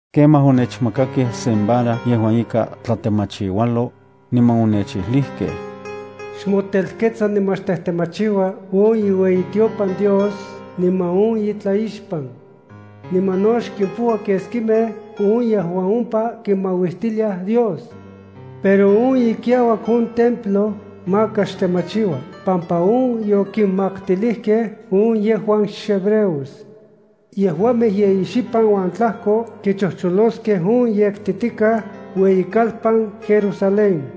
Kemaj, onechmakakej sen vara yejuan ika tlatemachiualo, niman onechijlijkej: “Xmotelketsa niman xtejtemachiua on iueyitiopan Dios niman on itlaixpan. Niman no xkimpoua keskimej on yejuan ompa kimauistiliaj Dios. Pero on ikiauak on templo maka xtemachiua pampa on yokinmaktilijkej on yejuan xhebreos. Yejuamej yeyi xipan uan tlajko kichojcholoskej on yektitikaj ueyikalpan Jerusalén.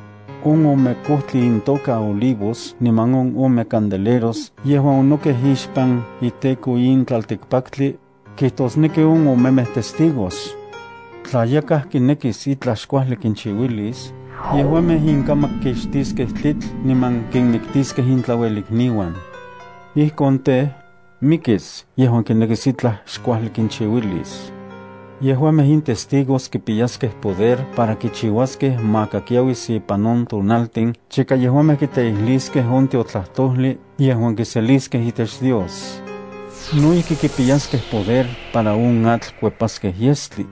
On ome kojtli intoka olivos niman on ome candeleros yejuan onokej ixpan iTEKO in tlaltikpaktli, kijtosneki on omemej testigos. Tla yakaj kinekis ijtlaj xkuajli kinchiuilis, yejuamej inkamak kixtiskej tlitl niman kinmiktiskej intlauelikniuan. Ijkon tej, mikis yejuan kinekis itlaj xkuajli kinchiuilis. Yejuamej in testigos kipiyaskej poder para kichiuaskej maka kiauis ipan on tonaltin chika yejuamej kiteijliskej on tiotlajtojli yejuan kiseliskej itech Dios. No ijki kipiyaskej poder para on atl kuepaskej yestli.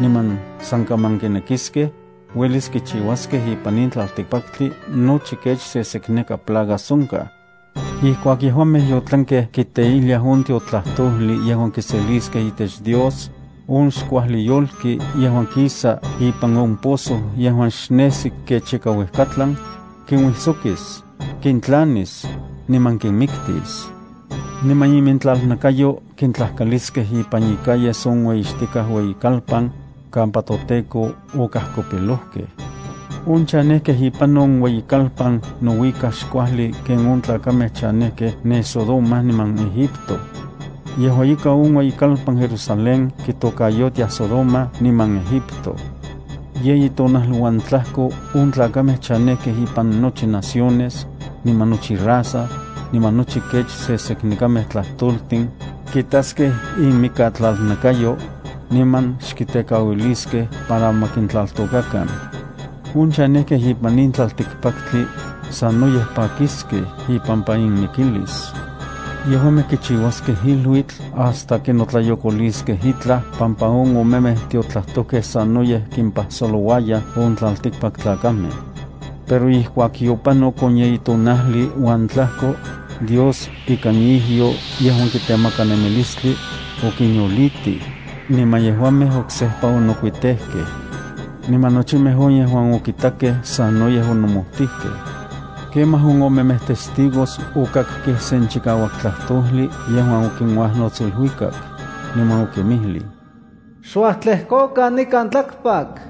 Niman san kaman kinekiskej, uelis kichiuaskej ipan in tlaltikpaktli nochi kech sesekneka plagas onkaj. Ijkuak yejuamej yotlankej kiteijliaj on tiotlajtojli yejuan kiseliskej itech Dios, on xkuajli yolki yejuan kisa ipan on pozo yejuan xnejsi kech ika uejkatlan, kinuijsokis, kintlanis niman kinmiktis. Niman inmikatlalnakayo kintlajkaliskej ipan icalles on ueyixtikaj ueyikalpan, kampa toTEKO okajkopilojkej. On chanejkej ipan on ueyikalpan nouikaj xkuajli ken on tlakamej chanejkej ne Sodoma niman Egipto. Yejua ika, on ueyikalpan Jerusalén kitokayotiaj Sodoma niman Egipto. Yeyi tonajli uan tlajko on tlakamej chanejkej ipan nochi naciones, niman nochi raza, niman nochi kech seseknekamej tlajtoltin, kitaskej inmikatlalnakayo, niman xkitekauiliskej para ma kintlaltokakan. On chanejkej ipan in tlaltikpaktli, sanoyej pakiskej ipampa inmikilis. Yejuamej kichiuaskej iluitl hasta kinotlayokoliskej itlaj pampa on omemej tiotlajtojkej sanoyej kimpajsolouayaj on tlaltikpaktlakamej. Pero ijkuak yopanok on yeyi tonajli uan tlajko, Dios ikan ijyo yejuan kitemaka nemilistli, okinyolitij, niman yejuamej oksejpa onokuitejkejkej. Niman nochimej on yejuan okitakej sanoyej onomojtijkej. Kemaj on omemej testigos okakkej sen chikauak tlajtojli yejuan okinuajnots iluikak, niman okinmijlij: “Xuajtlejkokan nikan tlakpak.”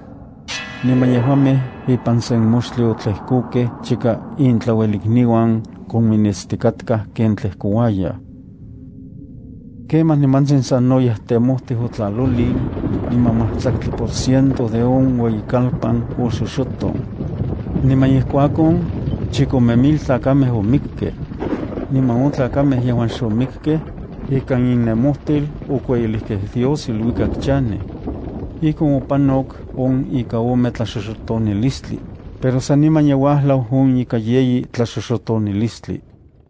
Niman yejuamej ipan sen moxtli otlejkokej chika intlauelikniuan kominitstikatkaj ken tlejkouayaj. Kemaj nimantsin sanoyej temojtij otlalolin, niman majtlaktli por ciento de on ueyikalpan oxoxoton. Niman ijkuakon, chikome mil tlakamej omikkej. Niman on tlakamej yejuan xomikkej, ikan innemojtil okueyilijkej Dios iluikak chanej. Ijkon opanok on ika ome tlaxoxotonilistli, pero saniman ye uajlau on ika yeyi tlaxoxotonilistli.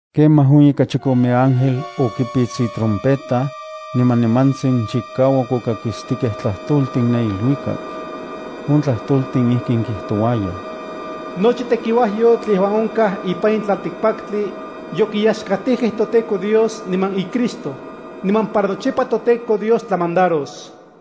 Kemaj on ika chikome ángel okipits itrompeta, niman nimantsin chikauak okakistikej tlajtoltin ne iluikak. On tlajtoltin ijkin kijtouayaj: “Nochi tekiuajyotl yejuan onkaj ipan in tlaltikpaktli, yokinoyaxkatij toTEKO Dios niman iCristo, niman para nochipa toTEKO Dios tlamandaros.”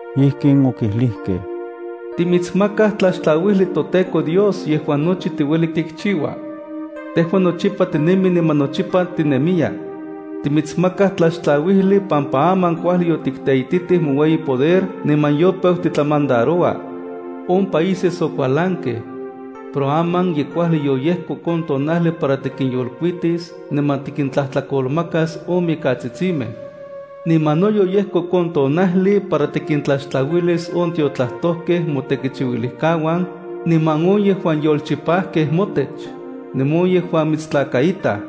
Ijkin okijlijkej: “Timitsmakaj tlaxtlauijli toTEKO Dios yejuan nochi tiueli kichiua. Tejua nochipa tinemi niman nochipa tinemiya. Timitsmakaj tlaxtlauijli pampa aman kuajli yotikteititij moueyi poder, niman yopeu titlamandaroua. On países okualankej. Pero aman ye kuajli yoyejkok on tonajli para tikinyolkuitis, niman tikintlajkolmakas on mikatsitsimej. Niman no yoyejkok on tonajli para tikintlaxtlauilis on tiotlajtojkej motekichiuilijkauan, niman on yejuan yolchipajkej motech, niman on yejuan mitstlakaitaj.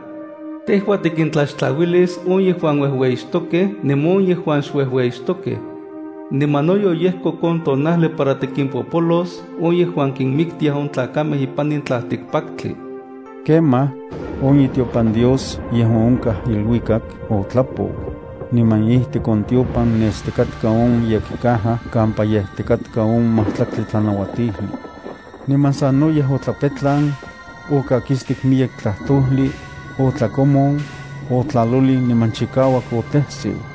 Tejua tikintlaxtlauilis on yejuan uejueyixtokej niman on yejuan xuejueyixtokej. Niman no yoyejkok on tonajli para tikimpopolos on yejuan kinmiktiaj on tlakamej ipan in tlaltikpaktli.” Kemaj, on itiopan Dios yejuan onkaj iluikak otlapou, niman ijtik on tiopan nestikatka on yekcaja kampa yejtikaj on majtlaktli tlanauatijli. Niman sanoyej otlapetlan, otlakakistik miyek tlajtojli, otlakomon, otlalolin niman chikauak otejsiu.